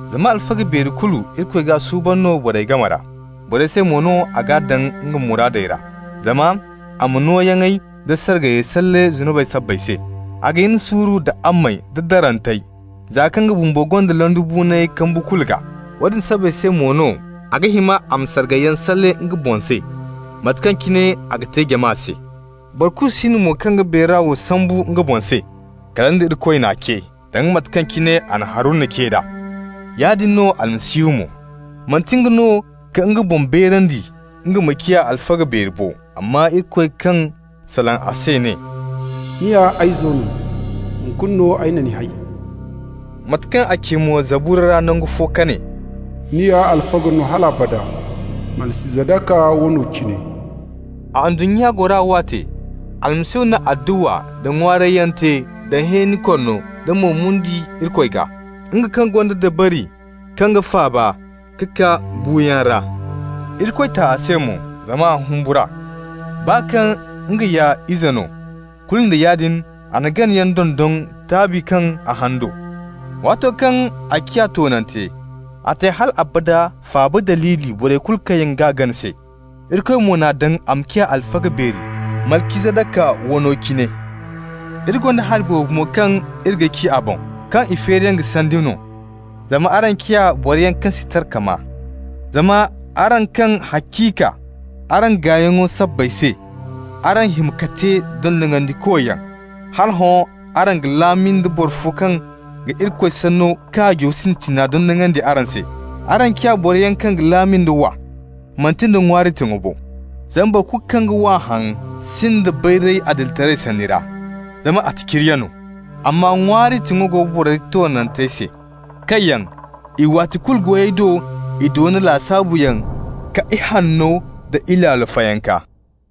Zama alfaga beeri kulu, Irikoy g'a suuban no borey game ra. Borey se mo no a g'a daŋ nga muraadey ra, zama a ma nooyaŋey da sargayey salle zunubey sabbay se. A ga hin suuru nda ammey da darantey, za kaŋ nga bumbo gonda londibuunay kambu kulu gaa. Woodin sabbay se mo no a ga hima a ma sargayyaŋ salle nga boŋ se, mate kaŋ cine a ga te jama se. Boro kulu si no mo kaŋ ga beera wo sambu nga boŋ se -- kala nda Irikoy n'a ce, danga mate kaŋ cine a na Haruna ce d'a. Yaadin no Almasihu mo. Manti nga no ka nga boŋ beerandi nga ma ciya alfaga beeri bo, amma Irikoy kaŋ salaŋ a se ne: «Ni ya ay izo no. Hunkuna no ay na ni hay.» Mate kaŋ a ci mo Zabura ra nangu fo ka ne: «Ni ya alfaga no hal abada, Malcizadaka wano cine.» A ndunnya gora waate, Almasihu na adduwa nda ŋwaarayyaŋ te da hẽeni korno nda mo-mundi Irikoy gaa, nga kaŋ gonda dabari kaŋ g'a faaba ka kaa buuyaŋ ra. Irikoy ta a se mo zama a humbur'a. Baa kaŋ nga ya ize no, kulu nda yaadin a na ganayaŋ dondon taabi kaŋ a haŋ do. Waato kaŋ a ciya toonante, a te hal abada faaba daliili borey kulu kaŋ yaŋ g'a gana se. Irikoy mo n'a daŋ a ma ciya alfaga beeri, Malcizadaka wano cine. Iri gonda hari boobo mo kaŋ iri ga ci a boŋ, kaŋ i feeriyaŋ ga sandi no, zama araŋ ciya boroyaŋ kaŋ si tara ka maa. Zama araŋ kaŋ haciika araŋ gayyaŋo sabbay se, araŋ hima ka te dondonandikoyaŋ, hala hõ araŋ ga laami nda boro fo kaŋ ga Irikoy Sanno kaajo sintina dondonandi araŋ se. Araŋ ciya boroyaŋ kaŋ ga laami nda wa, manti nda ŋwaari tiŋo bo. Zama boro kulu kaŋ ga wa haŋ sinda bayray adilitaray sanni ra, zama attaciriya no. Amma ŋwaari tiŋo go boro toonantey se, kaŋ yaŋ i waati kulu goyey do i doona lasaabuyaŋ ka ihanno da ilaalo fayanka.